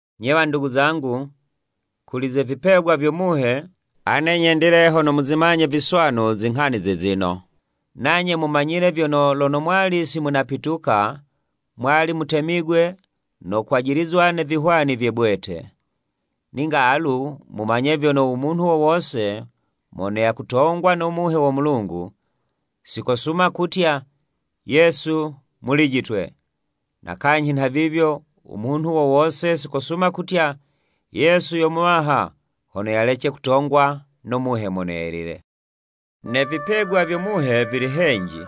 Nye wandugu zangu, kuli ze vipegwa vyo Muhe, ane nyendile hono muzimanye viswanu zinghani zizino, nanye mumanyile vyono lono mwali si munapituka, mwali mutemigwe no kwajilizwa ne vihwani vye bwete. Ninga alu mumanye vyono u munhu wo wose mono yakutongwa no Muhe wo Mulungu si kosuma kutya, “Yesu mulijitwe!” Na kanyhi nha vivyo, u munhu wo wose si kosuma kutya, “Yesu yo Muwaha,” hono yalece kutongwa no Muhe Mono Yelile. Ne vipegwa vyo Muhe vili henji,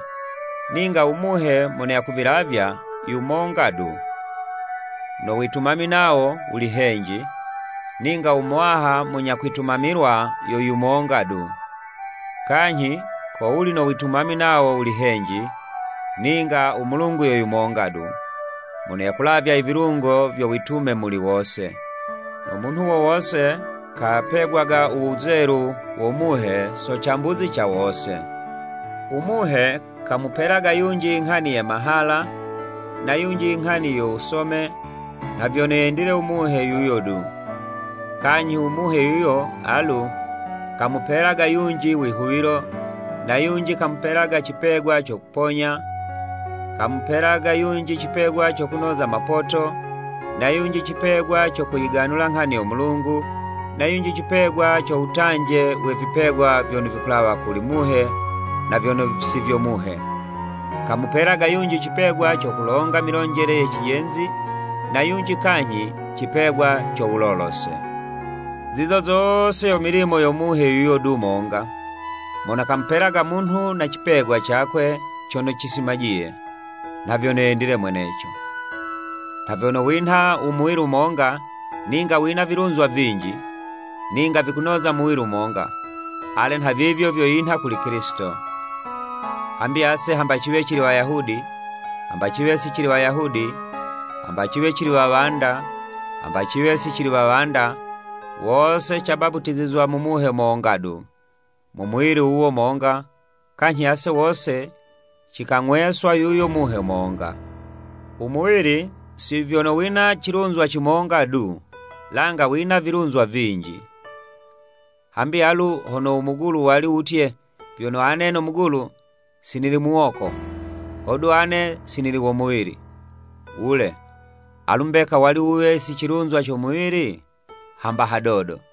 ninga u Muhe mono yakuvilavya yumonga du. No witumami nawo wuli henji, ninga u Muwaha munya kwitumamilwa yo yumonga du. Kanyhi ko wuli no witumami nawo wuli henji, ninga u Mulungu yo monga du, mono yakulavya ivilungo vyo witume muli wose. No munhu wo wose kapegwaga u wuzelu wo Muhe so cambuzi ca wose. U Muhe kamupelaga yunji i nghani ye mahala, na yunji i nghani yo wusome, nha vyono yendile u Muhe yuyo du. Kanyhi u Muhe yuyo alu, kamupelaga yunji wihuwilo, na yunji kamupelaga cipegwa co kuponya, kamupelaga yunji cipegwa co kunoza mapoto, na yunji cipegwa co kuyiganula nghani yo Mulungu, na yunji cipegwa co wutanje we vipegwa vyono vikulawa mu Muhe na vyono si vyo Muhe, kamupelaga yunji cipegwa co kulonga milonjele ye cijenzi, na yunji kanyhi cipegwa co wulolose. Zizo zose yo milimo yo Muhe yuyo du monga, mono kamupelaga munhu na cipegwa cakwe cono cisimajiye, nha vyono yendile mweneco. Nha vyono winha u muwili monga, ninga wina wilunzwa vinji, ninga vikunoza muwili monga, ale nhavivyo vyo yinha kuli Kilisito. Hambi ase hamba ciwe cili Wayahudi, hamba ciwe si cili Wayahudi, hamba ciwe cili wawanda, hamba ciwe si cili wawanda, wose cabaputizizwa mu Muhe monga du, mu muwili wuwo monga, kanyhi ase wose cikang'weswa yuyo Muhe monga. U muwili si vyono wina cilunzwa cimonga du, langa wina vilunzwa vinji. Hambi alu hono u mugulu wali wutye, “Vyono ane no mugulu, si nili muwoko, hodu ane si nili wo muwili,” wule, alu mbeka wali wuwe si cilunzwa co muwili? Hamba hadodo!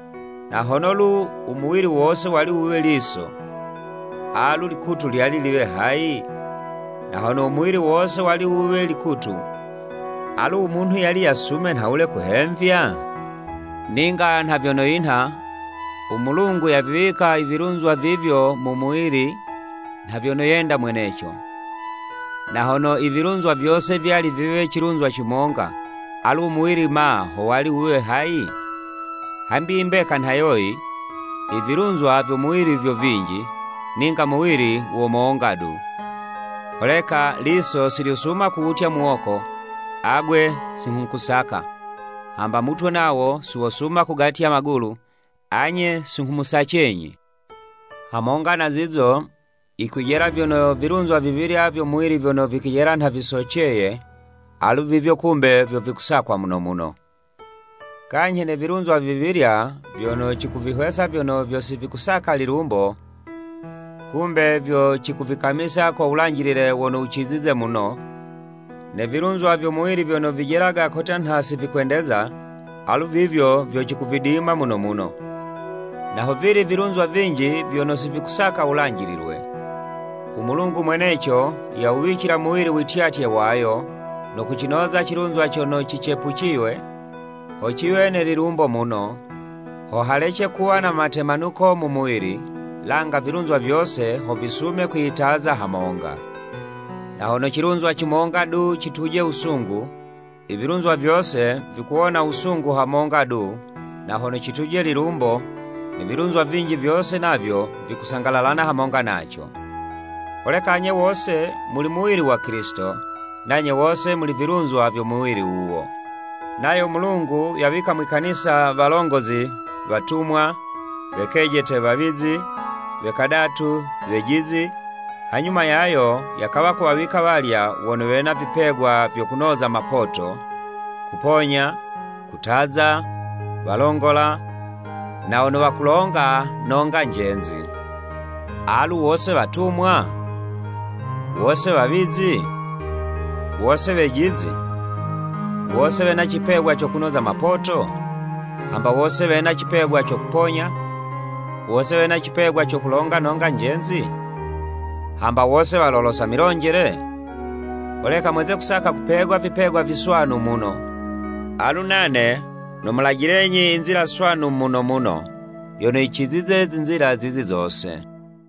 Na hono lu u muwili wose wali wuwe liso, alu likutu lyali liwe hayi? Na hono u muwili wose wali wuwe likutu, alu u munhu yali yasume nhawule kuhemvya. Ninga nha vyono yinha, u Mulungu yaviwika i vilunzwa vivyo mu muwili nha vyono yenda mweneco. Na hono i vilunzwa vyose vyali viwe cilunzwa cimonga, alu u muwili ma ho wali wuwe hayi? Hambi i mbeka nha yoyi, i vilunzwa vyo muwili vyo vinji, ninga muwili wo monga du. Holeka liso si lyosuma kuwutya muwoko, “Agwe si nghukusaka,” hambo mutwe nawo si wosuma kugatya magulu, “Anye, si nghumusacenyi.” Hamonga na zizo, yikwijela vyono vilunzwa vivilya vyo muwili vyono vijelaga nha visoceye, alu vivyo kumbe vyo vikusakwa muno muno. Kanyhi ne vilunzwa vivilya vyono cikuvihwesa vyono vyo si vikusaka lilumbo, kumbe vyo cikuvikamisa ko wulanjilile wono wucizize muno, ne vilunzwa vyo muwili vyono vijelaga kotya nha si vikwendeza, alu vivyo vyo cikuvidima muno muno, na hovili vilunzwa vinji vyono si vikusaka wulanjililwe. U Mulungu mweneco yawuwicila muwili wityatye wayo, no kucinoza cilunzwa cono cicepuciywe, ho ciwe ne lilumbo muno, ho halece kuwa na matemanuko mu muwili, langa vilunzwa vyose ho visume kwiyitaza hamonga. Na hono cilunzwa cimonga du, cituje wusungu, i vilunzwa vyose vikuwona wusungu hamonga du na hono cituje lilumbo, ne vilunzwa vinji vyose navyo vikusangalalana hamonga naco. Holeka anye wose muli muwili wa Kilisito, nanye wose muli vilunzwa vyo muwili wuwo. Nayo u Mulungu yawika mwi'kanisa, walongozi, watumwa, we kejete, wawizi, we kadatu, wejizi, hanyuma yayo, yakawa kuwawika walya wono wena vipegwa vyo kunoza mapoto, kuponya, kutaza, walongola, na wono wakulonga nonga njenzi. Alu wose watumwa? Wose wawizi? Wose wejizi? Wose wena cipegwa co kunoza mapoto? Hamba wose wena cipegwa co kuponya? Wose wena cipegwa co kulonga nonga njenzi? Hamba wose walolosa milonjele? Holeka mweze kusaka kupegwa vipegwa viswanu muno. Alu nane nomulajilenyi i nzila swanu muno muno yono yicizize zinzila zizi zose.